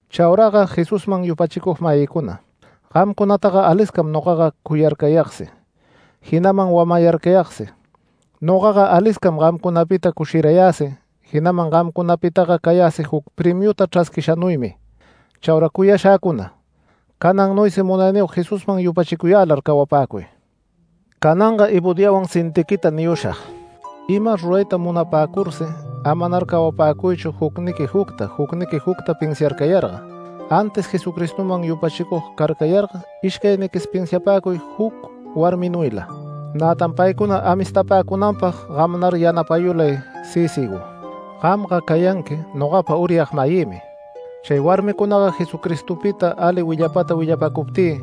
Chauraga Jesusman yupachicug-mayïcuna, gamcunataga aliscam nogaga cuyarcayagsi, jinaman wamayarcayagsi. Nogaga aliscam gamcunapita cushirayäsi jinaman gamcunapitaga cayäsi juc premiuta chrasquishanuymi. Chaura cuyashäcuna, canannuysi Munayniyog Jesusman yupachicuyälar cawapäcuy. Cananga Evodiawan Sintiqueta niyushag: Ima rurayta munapäcursi, amanar cawapäcuychu jucniqui jucta, jucniqui jucta pinsiarcayarga, antis Jesucristoman yupachicug carcayarga ishcayniquis pinsiapäcuy juc warminuyla. Nätan paycuna amistapäcunanpag gamnar yanapayulay Sícigo, gampa cayanqui nogapa uryag-mayïmi. Chay warmicunaga Jesuspita ali willapata willapacuptï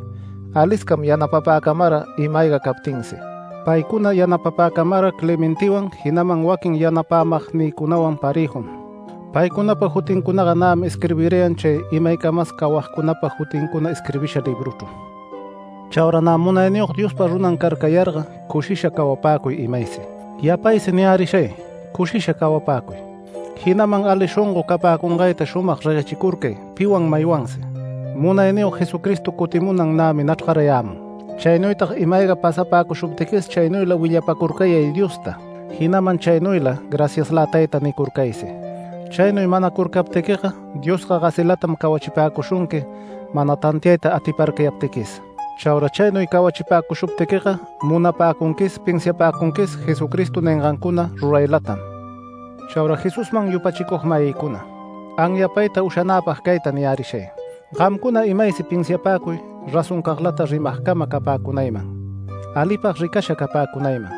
aliscam yanapapäcamara ima-ayga captinsi, paycuna yanapapacamara Clementewan, jinaman waquin yanapämagnïcunawan parëjum. Paycunapa jutincunaga nämi isquirbirayan, chay imaycamas cawagcunapa jutincuna isquirbisha libruchru. Chaura nä Munayniyog Diospa runan carcayarga cushisha cawapäcuy imaysi. Yapaysi niyärishay cushisha cawapäcuy. Jinaman ali shongo capäcungayta shumag reguechicurcay piwan maywansi. ¡Munayniyog Jesucristo cutimunan nämi nachrgayämun! Chaynuytag ima-ayga pasapäcushuptiquis chaynuyla willapacurcayay Diosta, jinaman chaynuyla “Graciaslä Tayta” nicurcaysi. Chaynuy manacurcaptiquiga Diosga gasilatam cawachipäcushunqui mana tantiayta atiparcayaptiquis. Chaura chaynuy cawachipäcushuptiquiga munapäcunquis, pinsiapäcunquis Jesucristo ningancuna ruraylatam. Chaura Jesusman yupachicug-mayïcuna, anyapayta ushanäpag cayta niyärishay: Gamcuna imaysi pinsiapäcuy razoncaglata rimagcama capäcunayman, alipag ricasha capäcunayman,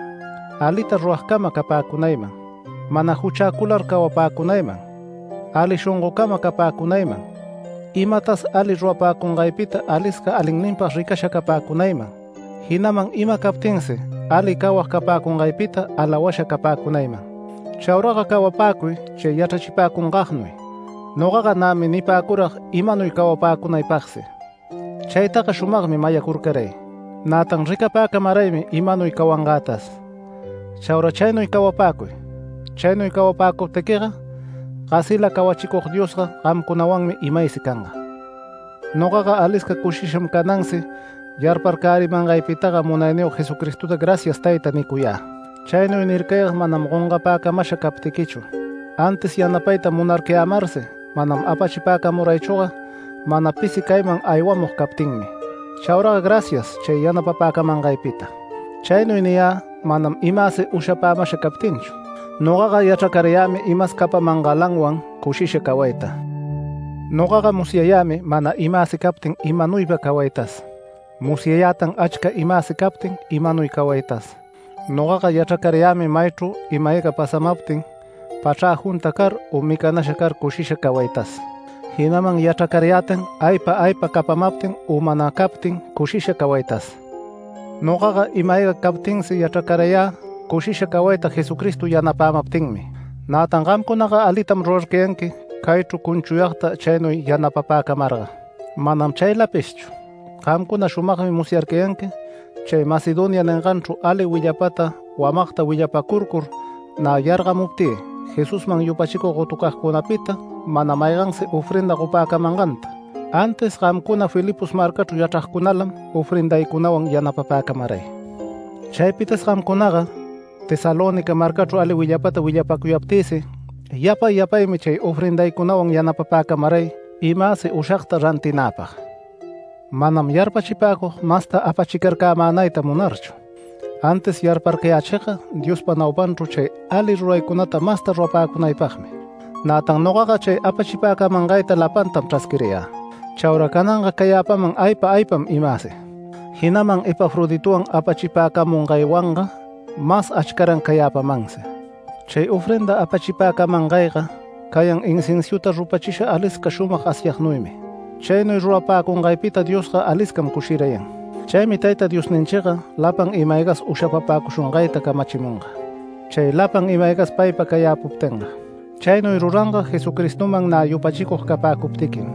alita ruragcama capäcunayman, mana juchäcular cawapäcunayman, ali shongocama capäcunayman, imatas ali rurapäcungaypita alisca alinninpag ricasha capäcunayman, jinaman ima captinsi ali cawag capäcungaypita alawasha capäcunayman. Chauraga cawapäcuy chay yachrachipäcungagnuy. Nogaga nämi nipäcurag imanuy cawapäcunaypagsi. Chaytaga shumagmi mayacurcaray, nätan ricapäcamaraymi imanuy cawangätas. Chaura chaynuy cawapäcuy. Chaynuy cawapäcuptiquiga, gasila cawachicug Diosga gamcunawanmi imaysi canga. Nogaga alisca cushisham canansi yarparcärimangaypitaga Munayniyog Jesucristota “Gracias Tayta” nicuyä. Chaynuy nircayag manam gongapäcamasha captiquichu, antis yanapayta munarcayämarsi mana apachicamaraychüga mana pisi cayman aywamug captinmi. Chauraga gracias chay yanapapäcamangaypita. Chaynuy niyä manam imäsi ushapämasha captinchu. Nogaga yachracarayämi imas capamangälawan cushisha cawayta. Nogaga musyayämi mana imäsi captin imanuypa cawaytas. Musyayätan achca imäsi captin imanuy cawaytas. Nogaga yachracarayämi maychru ima-ayga pasamaptin, pachrä junta car u micanasha car cushisha cawaytas, jinaman yachracarayätan aypa aypa capamaptin u mana captin cushisha cawaytas. Nogaga ima-ayga captinsi yachracarayä cushisha cawayta Jesucristo yanapämaptinmi. Nätan gamcunaga alitam rurarcayanqui caychru cunchuyagta chaynuy yanapapäcamarga. Manam chaylapishchu, gamcuna shumagmi musyarcayanqui chay Macedonia ninganchru ali willapata wamagta willapacurcur nä yargamuptï Jesusman yupachicug gotucagcunapita mana maygansi ofrenda gopäcamanganta, antis gamcuna Filipos marcachru yachragcunalam ofrendaycunawan yanapapäcamaray. Chaypitas gamcunaga Tesalónica marcachru ali willapata willapäcuyaptïsi yapay yapaymi chay ofrendaycunawan yanapapäcamaray imäsi ushagta rantinäpag. Manam yarpachipäcug masta apachicarcämänayta munarchu, antis yarparcayachigga Diospa naupanchru chay ali ruraycunata masta rurapäcunaypagmi. Nätan nogaga chay apachipäcamangayta lapantam chrasquirayä, chaura cananga cayäpaman aypa aypam imäsi. Jinaman Epafroditowan apachipäcamungaywanga mas achcaran cayäpamansi. Chay ofrenda apachipäcamangayga cayan inciensuta rupachisha alisca shumag asyagnuymi. Chaynuy rurapäcungaypita Diosga aliscam cushirayan. Chaymi Tayta Diosninchiga lapan ima-aygas ushapapäcushungayta camachimunga, chay lapan ima-aygas paypa cayäpuptinga. Chaynuy ruranga Jesucristoman nä yupachicug capäcuptiquim.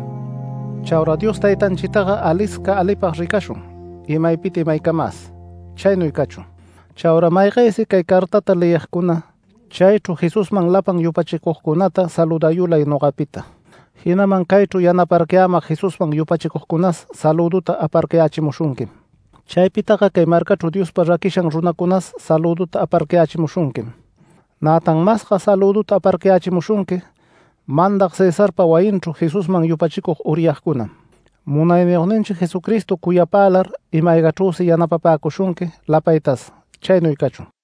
Chaura Dios Taytanchitaga alisca alipag ricashun, imaypita imaycamas. Chaynuy cachun. Chaura maygaysi cay cartata leyigcuna, chaychru Jesusman lapan yupachicugcunata saludayulay nogapita, jinaman caychru yanaparcayämag Jesusman yupachicugcunas salüduta aparcayächimushunquim. Chaypitaga cay marcachru Diospa raquishan runacunas salüduta aparcayächimushunquim. Nätan masga salüduta aparcayächimushunqui mandag Cesarpa wayinchru Jesusman yupachicug uryagcunam. Munayniyogninchi Jesucristo cuyapälar ima-aygachrüsi yanapapäcushunqui lapaytas. Chaynuy cachun.